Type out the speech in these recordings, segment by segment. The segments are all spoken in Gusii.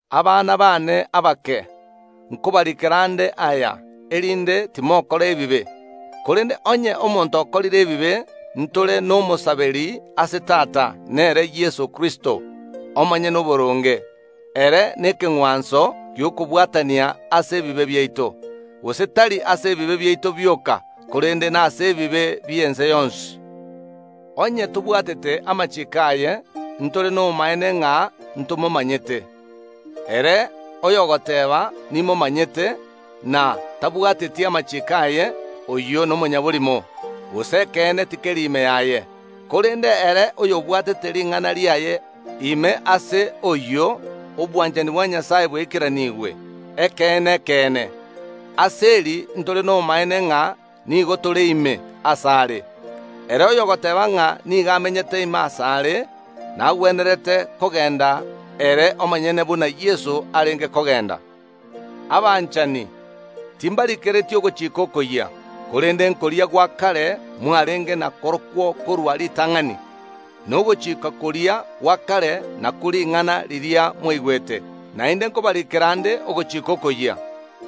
Abana baane abake, nkobariikera nde aya, erinde timokora ebibe. Korende onye omonto okorire ebibe, ntore n’Omosaberi ase Tata, nere Yeso Kristo, Omonyene Oboronge. Ere nekeng’wanso gi’okobwatania ase ebibe biaito, gose tari ase ebibe biaito bioka, korende nase ebibe bi’ense yonsi. Onye tobwatete amachiiko aye, ntore nobomaene ng’a ntomomanyete. Ere oyogoteeba, “Nimomanyete,” na tabwateti amachiiko aye, oyio nomonyaborimo, gose ekeene tikeri ime yaye. Korende ere oyobwatete ring’ana riaye, ime ase oyio obwanchani bwa Nyasae bwaikeranigwe ekeene ekeene. Ase eri ntore nobomaene ng’a nigo tore ime asare: Ere oyogoteeba ng’a nigo amenyete ime asare, nagwenerete kogenda ere omonyene buna Yeso arenge kogenda. Abanchani, timbarikereti ogochika okoyia, korende nkoria gwa kare mwarenge na korokwo korwa ritang’ani. Na ogochika koria gwa kare nakwo ring’ana riria mwaigwete. Naende nkobariikera nde ogochika okoyia,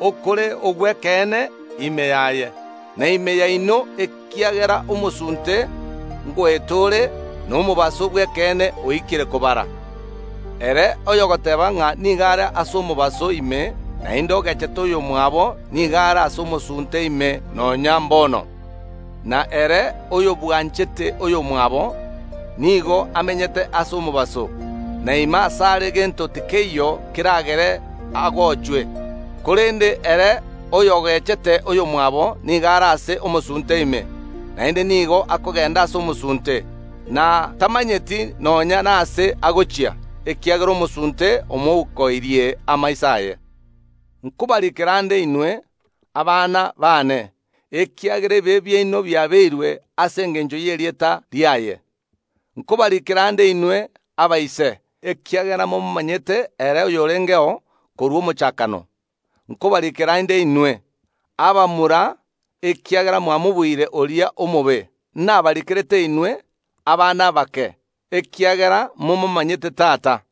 okore ogw’ekeene ime yaye, na ime yaino, ekiagera omosunte ngoeta ore, na omobaso bw’ekeene oikire kobara. Ere oyogoteeba ng’a nigo are ase omobaso ime, naende ogechete oyomwabo, nigo are ase omosunte ime nonya mbono, na ere oyobwanchete oyomwabo nigo amenyete ase omobaso, na ime asare gento tikeiyo keragere agochwe. Korende ere oyogechete oyomwabo nigo are ase omosunte ime, naende nigo akogenda ase omosunte, na tamanyeti nonya nase agochia, ekiagera omosunte omoukoirie amaiso aye. Nkobariikera nde inwe, abana baane, ekiagera ebibe biaino biaabeirwe ase engencho y’erieta riaye. Nkobariikera nde inwe abaise, ekiagera momomanyete ere oyorengeo korwa omochakano. Nkobariikera nde inwe, abamura, ekiagera mwamobuire oria omobe. Nabarikerete inwe, abana abake, ekiagera momomanyete Tata.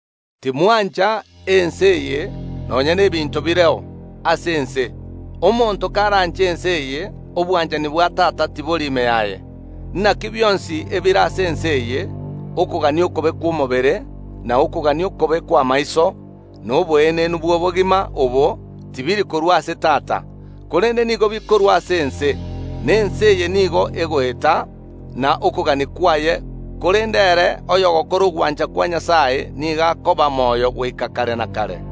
Timwancha ense eye, nonya n’ebinto bire ase ense. Omonto karanche ense eye, obwanchani bwa Tata tibori ime yaye. Naki bionsi ebire ase ense eye, okogania okobe kw’omobere, na okogania okobe kw’amaiso, na oboenenu bw’obogima obo, tibiri korua ase Tata, korende nigo bikorua ase ense. Na ense eye nigo egoeta, na okogania kwaye, korende ere oyogokora ogwancha kwa Nyasae nigo akoba moyo goika kare na kare.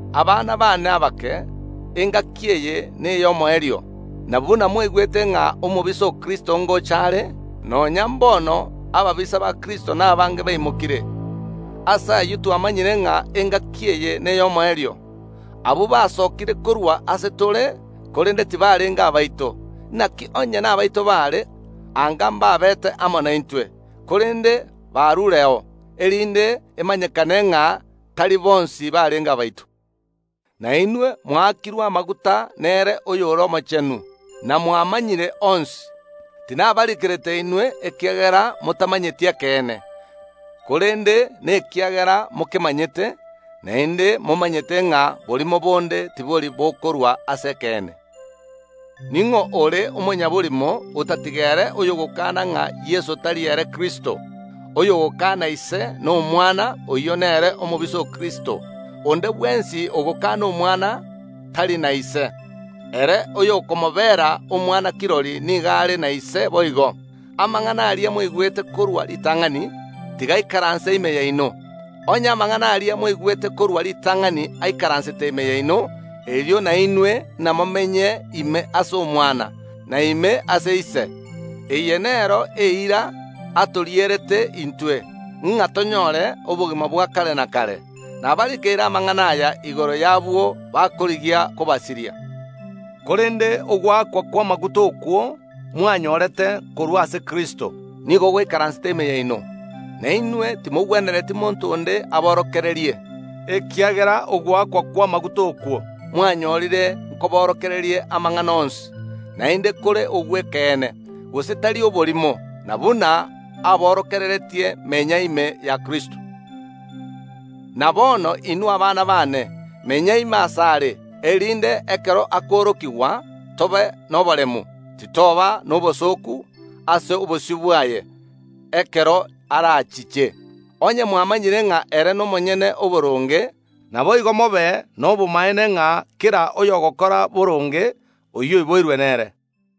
Abana baane abake, engaki eye ney’omoerio. Na buna mwaigwete ng’a omobisa o Kristo ngocha are, nonya mbono ababisa ba Kristo nabange baimokire. Ase ayio twamanyire ng’a engaki eye ney’omoerio. Abwo basokire korwa ase tore, korende tibarenge abaito. Naki onye nabaito baare, anga mbabete amo naintwe. Korende barureo, erinde emanyekane ng’a tari bonsi barenge abaito. Na inwe mwaakirwe amaguta nere oyore Omochenu, na mwamanyire onsi. Tinabarikerete inwe, ekiagera motamanyeti ekeene, korende nekiagera mokemanyete, naende momanyete ng’a borimo bonde tibori bokorwa ase ekeene. Ning’o ore omonyaborimo otatiga ere oyogokaana ng’a Yeso tari ere Kristo? Oyogokaana Ise na Omwana, oyio nere omobisa o Kristo. Onde bwensi ogokana Omwana tari na Ise. Ere oyokomobera Omwana kirori nigo are na Ise boigo. Amang’ana aria mwaigwete korwa ritang’ani, tiga aikaranse ime yaino. Onye amang’ana aria mwaigwete korwa ritang’ani aikaransete ime yaino, erio nainwe namomenye ime ase Omwana, na ime ase Ise. Eye nero eira atorierete intwe, ng’a tonyore obogima bwa kare na kare. Nabarikeire amang’ana aya igoro y’abwo bakorigia kobasiria. Korende ogoakwa kw’amaguta okwo mwanyorete korwa ase Kristo nigo goikaransete ime yaino, na inwe timogwenereti monto onde aborokererie, ekiagera ogoakwa kw’amaguta okwo mwanyorire nkoborokererie amang’ana onsi, naende kore ogw’ekeene, gose tari oborimo. Na buna aborokereretie, menya ime ya Kristo. Na bono inwe abana baane, menya ime asare, erinde ekero akoorokigwa tobe noboremu, titoba nobosooku ase obosio bwaye ekero arachiche. Onye mwamanyire ng’a ere nomonyene oboronge, naboigo mobe nobomaene ng’a kera oyogokora boronge, oyio oiboirwe nere.